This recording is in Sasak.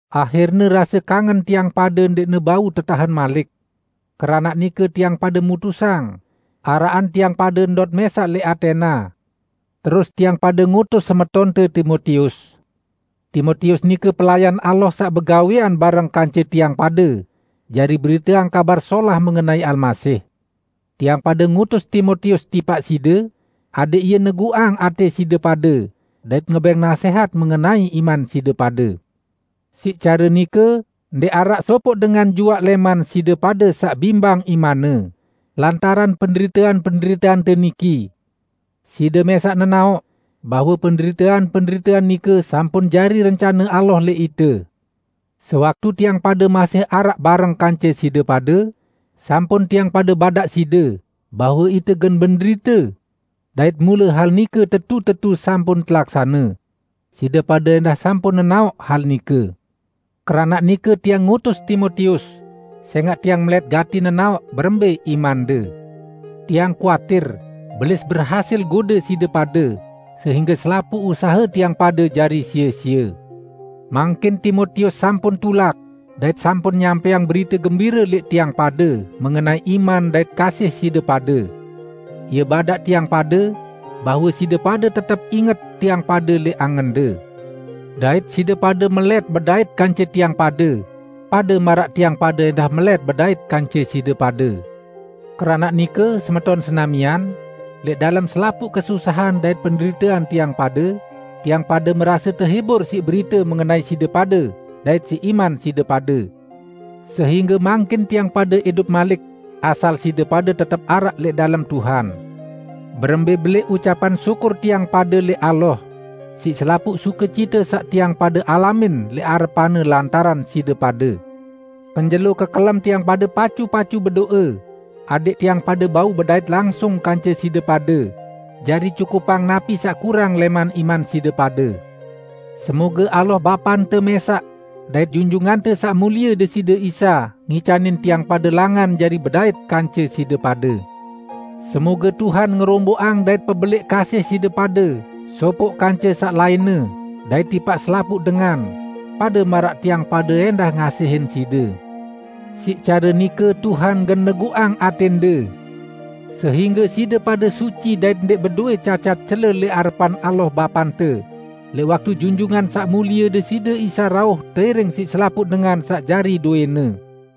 Ahirne rase kangen tiang pade ndẽqne bau tetahen malik. Keranaq nike tiang pade mutusang araqan tiang pade ndot mẽsaq lẽq Atena, terus tiang pade ngutus semetonte Timotius. Timotius nike pelayan Allah saq begawẽan bareng kance tiang pade jari beriteang Kabar Solah mengenai Almasih. Tiang pade ngutus Timotius tipaq side, adẽq ie neguqang atẽ side pade dait ngebẽng nasẽhat mengenai iman side pade. Siq care nike ndẽq araq sopoq dengan juaq lẽman side pade saq bimbang imanne lantaran penderitean-penderiteante niki. Side mẽsaq nenaoq bahwe penderitean-penderitean nike sampun jari rencane Allah lẽq ite. Sewaktu tiang pade masih araq bareng kance side pade, sampun tiang pade badaq side bahwe ite gen menderite. Dait mule hal nike tetu-tetu sampun telaksane; side pade ẽndah sampun nenaoq hal nike. Keranaq nike tiang ngutus Timotius, sẽngaq tiang melẽt gati nenaoq berembẽ imande. Tiang kuatir Belis berhasil gode side pade sehingge selapuq usahe tiang pade jari sie-sie. Mangkin Timotius sampun tulak dait sampun nyampẽang berite gembire lẽq tiang pade mengenai iman dait kasih side pade. Ie badaq tiang pade bahwe side pade tetep inget tiang pade lẽq angende. Dait side pade melẽt bedait kance tiang pade, pade maraq tiang pade ẽndah melẽt bedait kance side pade. Keranaq nike, semeton senamian, lẽq dalem selapuq kesusahan dait penderitean tiang pade, tiang pade merase tehibur siq berite mengenai side pade dait siq iman side pade, sehingge mangkin tiang pade idup malik, asal side pade tetep araq lẽq dalem Tuhan. Berembẽ belẽq ucapan syukur tiang pade lẽq Allah siq selapuq sukecite saq tiang pade alamin lẽq arepan-Ne lantaran side pade. Kenjelo kekelem tiang pade pacu-pacu bedo'e, adẽq tiang pade bau bedait langsung kance side pade, jari cukupang napi saq kurang lẽq iman side pade. Semoge Allah Bapante mẽsaq, dait Junjungante Saq Mulie Deside Isa ngicanin tiang pade langan jari bedait kance side pade. Semoge Tuhan ngeromboqang dait pebelẽq kasih side pade sopoq kance saq lainne dait tipaq selapuq dengan, pade maraq tiang pade ẽndah ngasihin side. Siq care nike Tuhan gen neguqang atẽnde, sehingge side pade suci dait ndẽq bedowẽ cacat cele lẽq arepan Allah Bapante, lẽq waktu Junjungan Saq Mulie Deside Isa rauh teiring siq selapuq dengan saq jari dowẽ-Ne.